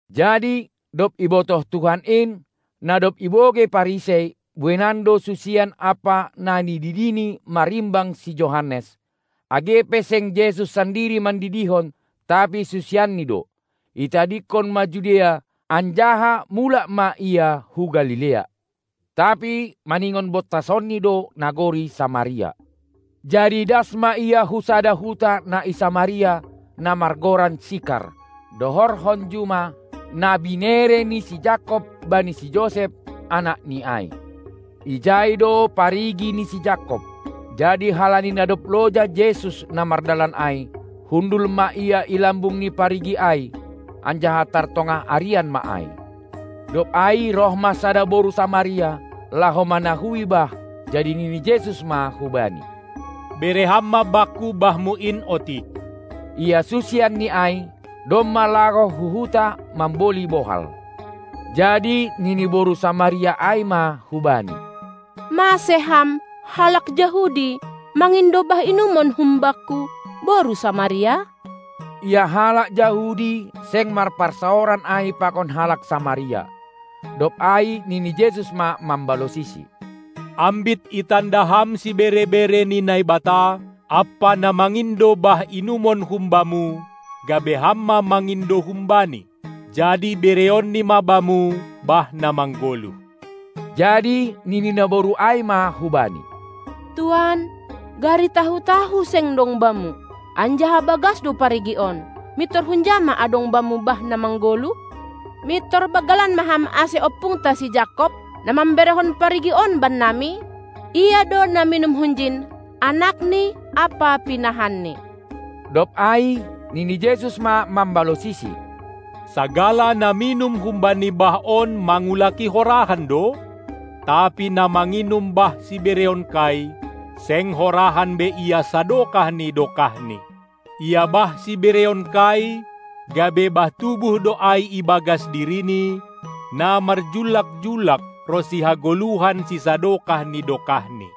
Jadi dob ibotoh Tuhan in, na dob ibogei Parisei, bueinan do susian ampa na nididiNi marimbang si Johannes. age pe seng Jesus sandiri mandidihon, tapi susianNi do, itadingkon ma Judea, anjaha mulak ma Ia hu Galilea. Tapi maningon bontasonNi do nagori Samaria. Jadi das ma Ia hu sada huta na i Samaria, na margoran Sikar, dohorhon juma, na binere ni si Jakob bani si Josep, anakni ai. Ijai do parigi ni si Jakob. Jadi halani na dob loja Jesus na mardalan ai, hundul ma Ia i lambung ni parigi ai, anjaha tar tongah arian ma ai. Dob ai roh ma sada boru Samaria, laho manahui bah. Jadi nini Jesus ma hubani: Bere ham ma Bakku bahmu in otik! Ia susianNi ai, domma laho hu huta mamboli bohal. Jadi nini boru Samaria ai ma hu-Bani: Mase Ham, halak Jahudi, mangindo bah inumon humbakku, boru Samaria? Ia halak Jahudi seng marparsaoran ai pakon halak Samaria. Dob ai nini Jesus ma mambalosisi: Ambit itanda ham sibere-bere ni Naibata ampa na mangindo bah inumon humbamu, gabe ham ma mangindo hum-Bani, jadi bereonNi ma bamu bah na maggoluh. Jadi nini naboru ai ma hubani: Tuan, gari tahu-tahu seng dong Bamu, anjaha bagas do parigi on; mintor hunja ma adong Bamu bah na manggoluh? Mintor banggalan ma Ham ase ompungta si Jakob, na mamberehon parigi on bannami? Ia do na minum hunjin, anakni ampa pinahanni. Dob ai nini Jesus ma mambalosisi: Sagala na minum humbani bah on mangulaki horahan do, tapi na manginum bah sibereonKai, seng horahan be ia sadokah ni dokahni. Ia bah sibereonKai gabe bah tubuh do ai ibagas dirini, na marjullak-jullak ronsi hagoluhan sisadokah ni dokahni.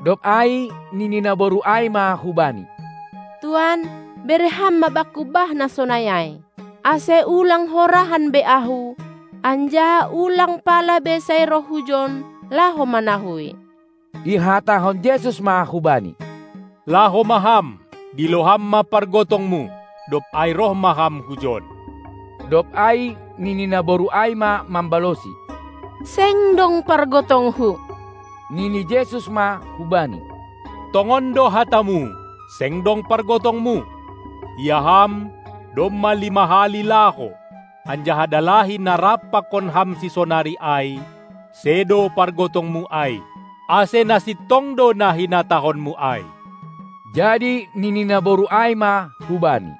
Dob ai nini naboru ai ma hubani: Tuan, bere Ham ma bakku bah na sonai ai, ase ulang horahan be ahu, anjaha ulang pala be sai roh hujon laho manahui. Ihatahon Jesus ma hubani: Laho ma ham, dilo ham ma pargotongmu, dob ai roh ma ham hujon! Dob ai nini naboru ai ma mambalosi: Seng dong pargotongku. Nini Jesus ma hubani: Tongon do hatamu, seng dong pargotongmu. Ia ham domma lima hali laho, anjaha dalahi na rap pakon ham sisonari ai, sedo pargotongmu ai; ase na sintong do na hinatahonmu ai. Jadi nini naboru ai ma hu-Bani: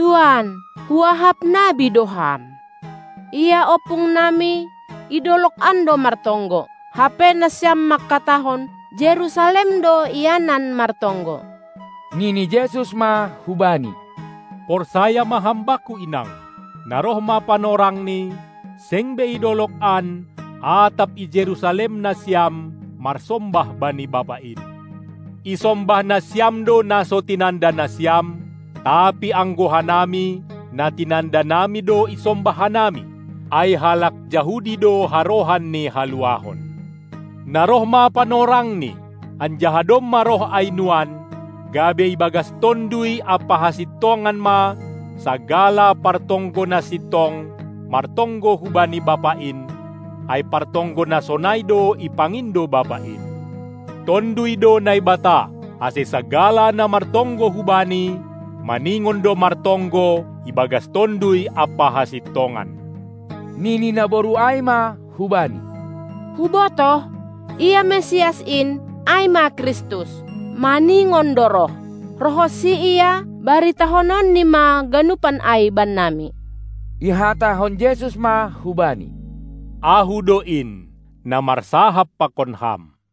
Tuan, huahap nabi do Ham! Ia ompung nami i dolog an do martonggo, hape nasiam mangkatahon, Jerusalem do ianan martonggo. Nini Jesus ma hubani: Porsaya ma ham Bakku inang, na roh ma panorangni, seng be i dolog an atap i Jerusalem nasiam marsombah bani Bapa in. Isombah nasiam do na so tinanda nasiam, tapi anggo hanami na tinanda nami do isombah hanami, ai halak Jahudi do harohan ni haluahon. Na roh ma panorangni, anjaha domma roh ai nuan, gabe ibagas Tonduy ampa hasintongan ma sagala partonggo na sintong martonggo hubani Bapa in, ai partonggo na sonai do ipangindo Bapa in. Tonduy do Naibata, ase sagala na martonggo hu Bani, maningon do martonggo ibagas Tonduy ampa hasintongan. Nini naboru ai ma hu-Bani: Hubotoh, ia Mesias in (ai ma Kristus), maningon do roh. Roh honsi Ia, baritahononNi ma ganupan ai bannami. Ihatahon Jesus ma hubani: Ahu do in, na marsahap pakon ham!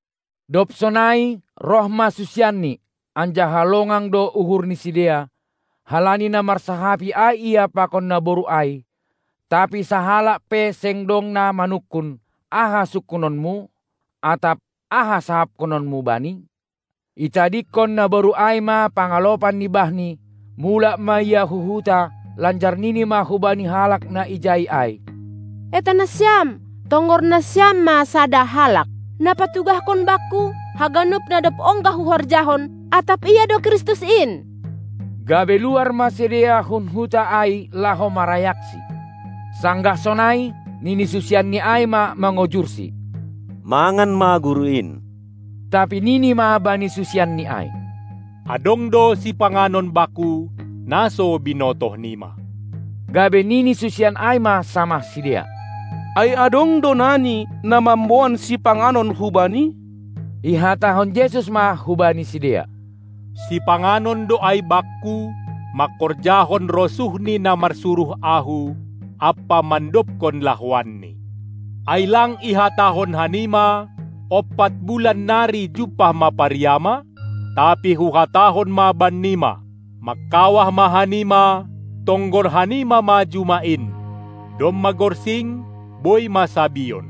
Dob sonai, roh ma susianNi, anjaha longang do uhur ni sidea, halani na marsahapi ai Ia pakon naboru ai. Tapi sahalak pe seng dong na manungkun: Aha sungkunonmu? atap: Aha sahapkononmu bani? Itadingkon naboru ai ma pangalopan ni bahni, mulak ma ia hu huta lanjar nini ma hubani halak na ijai ai: Eta nasiam! Tonggor nasiam ma sada halak, na patugahkon bakku haganup na dob ongga huhorjahon, atap Ia do Kristus in. Gabe luar ma sidea hun huta ai laho marayakSi. Sanggah sonai, nini susianNi ai ma mangojurSi: Mangan ma Guru in! Tapi nini ma bani susianNi ai: Adong do sipanganon Bakku, na so binotohnima! Gabe nini susian ai ma samah sidea: Ai adong do nani, na mamboban sipanganon hu-Bani? Ihatahon Jesus ma hubani sidea: Sipanganon do ai Bakku, mangkorjahon rosuh ni na marsuruh Ahu ampa mandobkon lahoanni. Ai lang ihatahon hanima: Ompat bulan nari jumpah ma pariama? Tapi huhatahon ma bannima: Mangkawah ma hanima, tonggor hanima ma juma in, domma gorsing, boi ma sabion.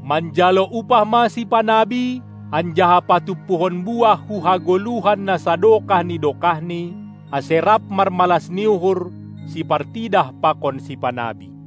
Manjalo upah ma sipanabi anjaha patumpuhon buah hu hagoluhan na sadokah ni dokahni, ase rap marmalas ni uhur sipartidah pakon sipanabi.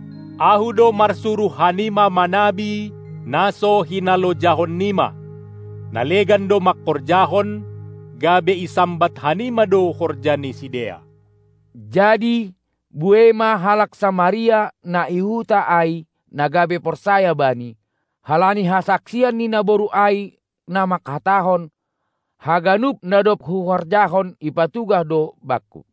Ahu do marsuruh hanima manabi na so hinalojahon nima. Na legan do mangkorjahon, gabe isambat hanima do horja ni sidea. Jadi buei ma halak Samaria na i huta ai na gabe porsaya Bani, halani hasaksian ni naboru ai na mangkatahon: Haganup, na dob huhorjahon ipatugah do bakku.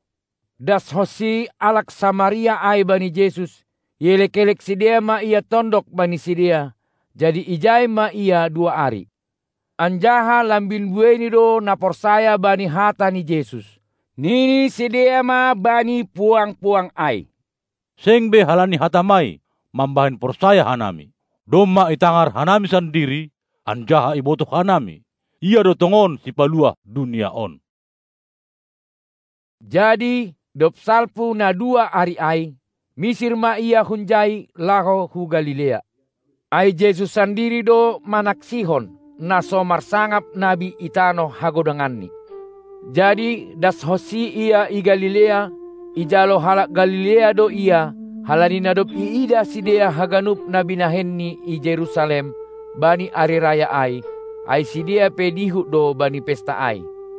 Das-honsi halak Samaria ai bani Jesus, ielek-elek sidea ma Ia tondok bani sidea, jadi ijai ma Ia dua ari. Anjaha lambin bueini do na porsaya bani hata ni Jesus. Nini sidea ma bani puang-puang ai: Seng be halani hatamai mambahen porsaya hanami. Domma itangar hanami sandiri, anjaha ibotoh hanami, Ia do tongon Sipaluah dunia on. Jadi dob salpu na dua ari ai, misir ma Ia hunjai laho hu Galilea. Ai Jesus sandiri do manaksihon, na so marsangap nabi i tanoh hagodanganni. Jadi dashonsi Ia i Galilea, ijalo halak Galilea do Ia, halani na dob iidah sidea haganup na binahenNi i Jerusalem bani ari raya ai, ai sidea pe dihut do bani pesta ai.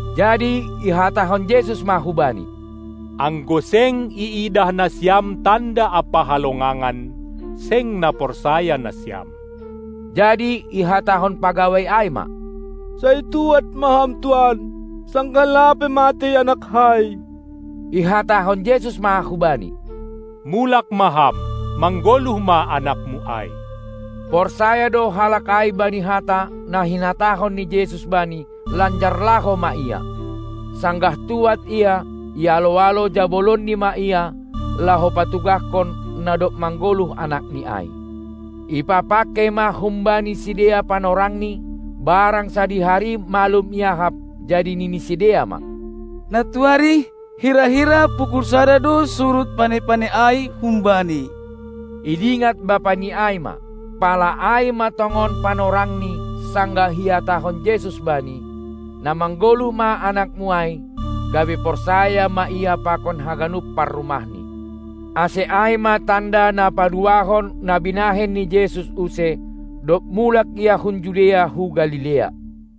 Jadi ihatahon Jesus ma hubani: Anggo seng iidah nasiam tanda ampa halongangan, seng na porsaya nasiam. Jadi ihatahon pagawai ai ma: Sai tuad ma Ham tuan sanggah lape matei anakkai. Ihatahon Jesus ma hubani: Mulak ma ham, manggoluh ma anakmu ai! Porsaya do halak ai bani hata, na hinatahon ni Jesus bani, lanjar laho ma ia. Sanggah tuad ia, ialo-alo jabolonni ma ia, laho patugahkon, na dob manggoluh anakni ai. Ipapangkei ma humbani sidea panorangni, barang sadihari malum iahap. Jadi nini sidea ma: Nantuari, hira-hira pukul sada do surut pane-pane ai humbani. Idingat bapani ai ma, pala ai ma tongon panorangni sanggah ihatahon Jesus bani: Na manggoluh ma anakmu ai. Gabe porsaya ma ia pakon haganup parrumahni. Ase ai ma tanda na paduahon, na binahen ni Jesus use, dob mulak Ia hun Judea hu Galilea.